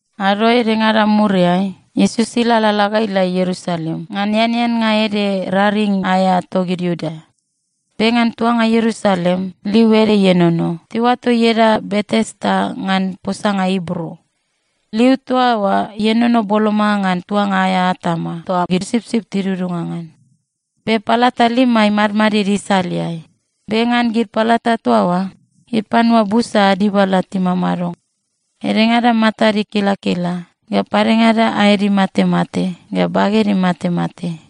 Ado edengada muriai, Iesus ilalala ga ila Ierusalem ngan eaneannga ede raring aea togid Iuda. Be ngan tuanga Ierusalem liu ede ienono, tiuato ieda Betesda ngan posanga Ibru. Liu toa oa ienono boloma ngan tuanga aea atama toa gid sipsip tidudunga ngan. Be palata lima imadmadid isaleai. Be ngan gid palata toa oa gid panua busa ad dibala timamado. Edengada matad ikilakila ga padengada aed imatemate ga baged imatemate.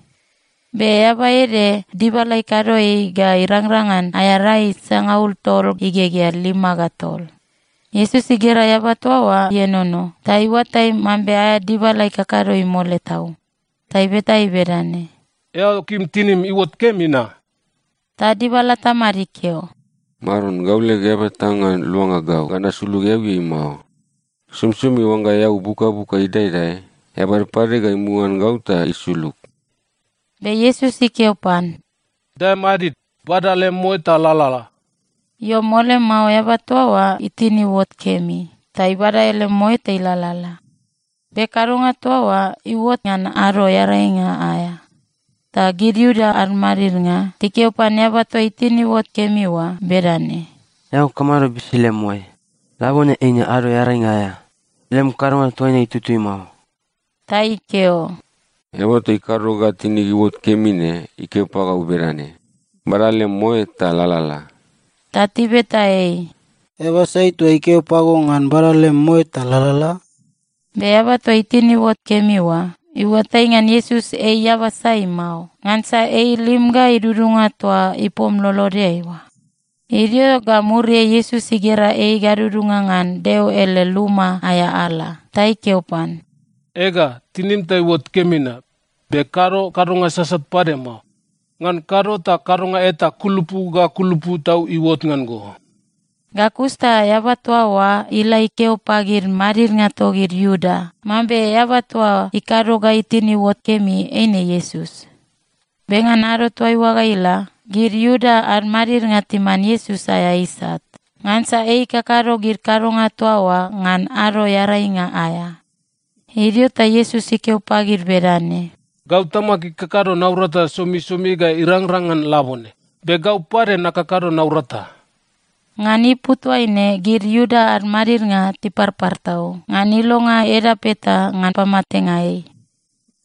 Be eaba ede, dibala ikado ei ga irangrang ngan aea rai sangaul tol igegea lima ga tol. Iesus igera eaba toa oa ienono ta iuatai mambe aea dibala ikakado ei mole tau. Ta ibeta ei bedane, “Eao kim tinim iuot kemi na?” Ta dibala tamad ikeo, “Maron, gau leg eaba eta ngan luanga gau ga nasulug eauiai mao. Somisomi oangga eau buk ga buk ga idaedae, eaba ede pade ga imuga ngan gau ta isulug.” Be Iesus ikeo pan, “Dae madid. Bada lem moe ta lalala.” Io, mole mao eaba toa oa itin iuot kemi ta ibada ele moe ta ilalala. Be kadonga toa oa iuot ngan Ado Earainga aea. Ta gid Iuda ad madidnga tikeo pan eaba toa itin iuot kemi oa bedane, “Eao kamado bisi lem moe? Labone eine ado Earainga aea! Lem kadonga toa ne itutui mao.” Ta ikeo, “Eaba toa ikado ga tinig iuot kemi ne ikeo pagau bedane, ‘Bada lem moe ta lalala.’” Ta tibeta ei, “Eaba sai toa ikeo pago ngan bada lem moe ta lalala?” Be eaba toa itin iuot kemi oa iuatai ngan Iesus ei eaba sai mao, ngansa ei ilim ga idudunga toa ipom lolodeai oa. Idio ga muriai Iesus igera ei gadudunga ngan Deo ele luma aea ala, ta ikeo pan, “Ega, tinim ta iuot kemi na. Be kado kadonga sasat pade mao. Ngan kado ta kadonga eta kulupu ga kulupu tau iuot ngan go.” Ga kus ta eaba toa oa ila ikeo pagid madidnga togid Iuda mambe eaba toa ikado ga itin iuot kemi, eine Iesus. Be ngan ado toaiua ga ila, gid Iuda ad madidnga timan Iesus aea isat, ngansa ei ikakado gid kadonga toa oa ngan Ado Earainga aea. Idio ta Iesus ikeo pagid bedane, “Gau Tamag ikakado naurata somisomi ga irangrang ngan labone, be gau pade nakakado naurata.” Ngan ipu toaine gid Iuda ad madidnga tiparpar tau ngan ilonga edap eta ngan pamatenga ei.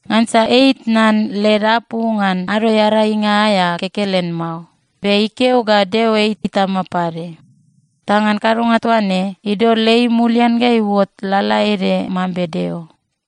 Ngansa ei itnan led apu ngan Ado Earainga aea kekelen mao, be ikeo ga Deo ei Itama pade. Ta ngan kadonga toa ne idol ei mulian ga iuot lalaede mambe Deo.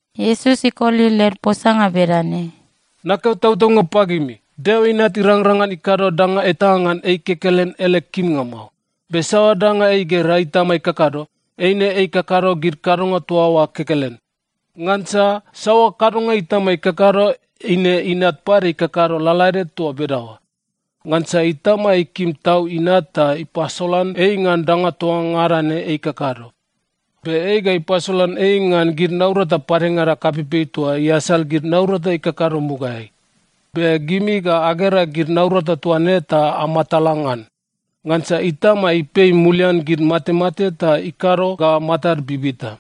Iesus ikoli led posanga bedane, “Nakeo tautaunga pagimi, Deo Inat irangrang ngan ikado danga eta ngan ei kekelen ele kimnga mao. Be saoa danga ei igera Itama ikakado, eine ikakado gid kadonga toa oa kekelen. Ngansa saoa kadonga Itama ikakado, eine Inat pade ikakado lalaede toa bedaoa. Ngansa Itama ikim tau Inat ta ipasolan ei ngan danga toa ngada ne ei ikakado. Be ei ga ipasolan ei ngan gid naurata padengada kapeipei toa iasal gid naurata ikakado mugaeai. Be gimi ga agera gid naurata toa ne ta amatala ngan. Ngansa Itama ipei mulian gid matemate ta ikado ga matad bibita.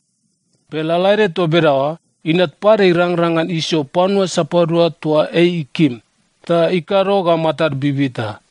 Be lalaede toa bedaoa, Inat pade irangrang ngan isio panua sapadua toa ei ikim, ta ikado ga matad bibita.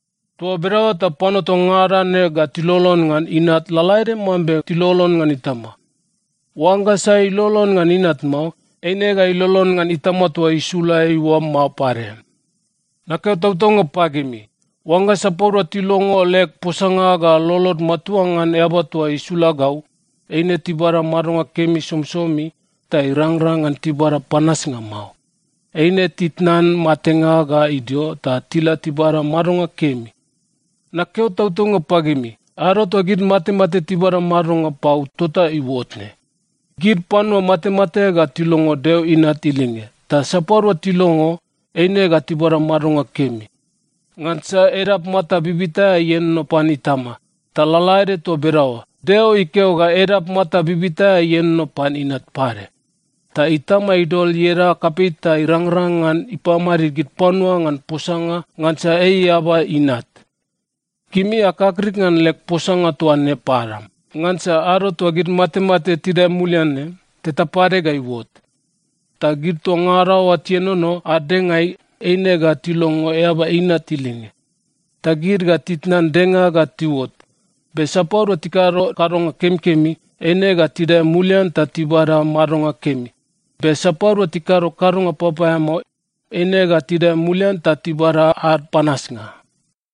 Toa bedaoa ta panua toa ngada ne ga tilolon ngan Inat lalaede mambe tilolon ngan Itama. Oangga sai ilolon ngan Inat mao, eine ga ilolon ngan Itama toa isula ei oa mao pade. “Nakeo tautaunga pagimi, oangga sapadua tilongo leg posanga ga lolod matua ngan Eaba toa isula gau, eine tibada madonga kemi somisomi, ta irangrang ngan tibada panasnga mao. Eine titnan matenga ga idio, ta tila tibada madonga kemi. Nakeo tautaunga pagimi, ado toa gid matemate tibada madonga pau tota iuot ne. Gid panua matemate ga tilongo Deo Inat ilinge, ta sapadua tilongo, eine ga tibada madonga kemi. Ngansa edap mata bibita aea ienono pan Itama, ta lalaede toa bedaoa, Deo ikeo ga edap mata bibita aea ienono pan Inat pade. Ta Itama idol ieda kapei ta irangrang ngan ipamadid gid panua ngan posanga, ngansa ei Eaba Inat. “Gimi akakrik ngan leg posanga toa ne padam, ngansa ado toa gid matemate tidae mulian ne, teta pade ga iuot. Ta gid toa ngada oa tienono ad dengaeai eine ga tilongo Eaba Inat ilinge. Ta gid ga titnan denga ga tiuot. Be sapadua tikado kadonga kemikemi, eine ga tidae mulian ta tibada madonga kemi, be sapadua tikado kadonga papaeamao, eine ga tidae mulian ta tibada ad panasnga.”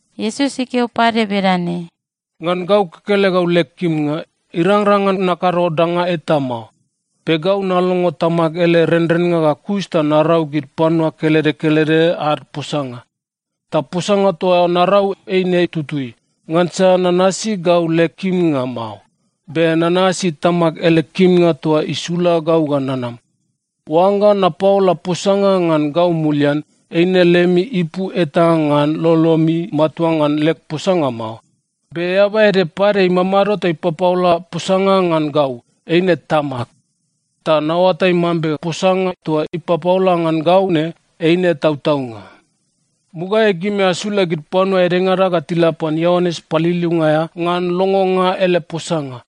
Iesus ikeo pade bedane, “Ngan gau kekelegau leg kimnga, irangrang ngan nakado danga eta mao. Be gau nalongo Tamag ele renrennga ga kus ta narau gid panua kelede kelede ad posanga. Ta posanga toa narau eine tutui, ngansa nanasi gau leg kimnga mao. Be nanasi Tamag ele kimnga toa isula gau ga nanam. “Oangga napaola posanga ngan gau mulian, eine lemi ipu eta ngan lolomi matua ngan leg posanga mao. Be Eaba ede pade imamado ta ipapaola posanga ngan gau, eine Tamag. Ta naoatai mambe posanga toa ipapaola ngan gau ne, eine tautaunga. “Mugaeai gimi asula gid panua edengada ga tila pan Ioanes Paliliunga aea ngan longonga ele posanga,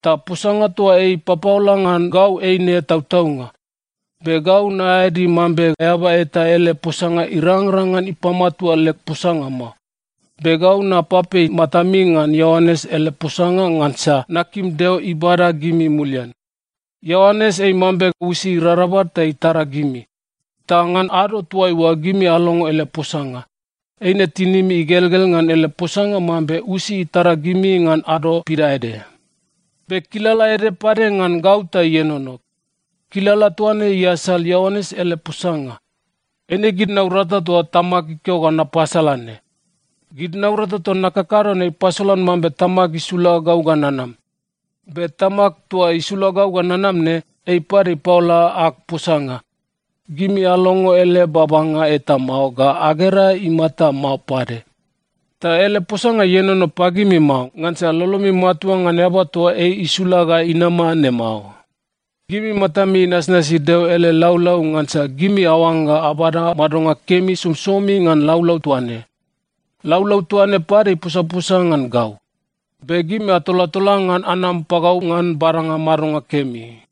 ta posanga toa ei ipapaola ngan gau eine tautaunga. Be gau naeadi mambe eaba eta ele posanga irangrang ngan ipamatua leg posanga mao. Be gau napapei matami ngan Ioanes ele posanga ngansa nakim Deo ibada gimi mulian. Ioanes ei mambe usi irarabal ta itara gimi. Ta ngan ado toaiua gimi alongo ele posanga, eine tinimi igelgel ngan ele posanga mambe usi itara gimi ngan ado pidaede. “Be kilala ede pade ngan gau ta ienono. Kilala toa ne iasal Ioanes ele posanga. Eine gid naurata toa Tamag ikeo ga napasala ne. Gid naurata toa nakakado ne ipasolan mambe Tamag isula gau ga nanam. Be Tamag toa isula gau ga nanam ne, ei pade ipaola ag posanga. Gimi alongo ele babanga eta mao ga agera imata mao pade. Ta ele posanga ienono pagimi mao, ngansa lolomi matua ngan eaba toa ei isula ga inama ne mao. Gimi matami inasnasi Deo ele laulau ngansa gimi aoangga abada madonga kemi somisomi ngan laulau toa ne. Laulau toa ne pade iposaposa ngan gau. Be gimi atolatola ngan anam pagau ngan badanga madonga kemi.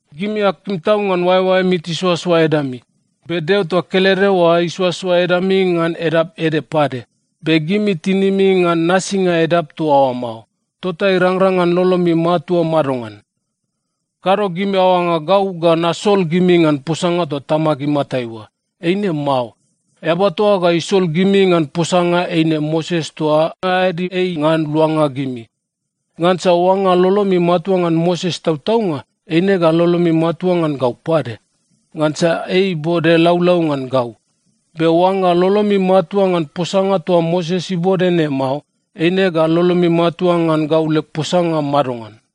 Gimi akim tau ngan oaeoaemi tisoasoa edami. Be Deo toa kelede oa isoasoa edami ngan edap ede pade. Be gimi tinimi ngan nasinga edap toa oa mao. Tota irangrang ngan lolomi matua madongan? “Kado gimi aoangga gau ga nasol gimi ngan posanga toa Tamag imatai oa. Eine mao. Eaba toa ga isol gimi ngan posanga eine Moses toa aeadi ei ngan luanga gimi. Ngansa oangga lolomi matua ngan Moses tautaunga, eine ga lolomi matua ngan gau pade, ngansa ei ibode laulau ngan gau. Be oangga lolomi matua ngan posanga toa Moses ibode ne mao, eine ga lolomi matua ngan gau leg posanga madongan?”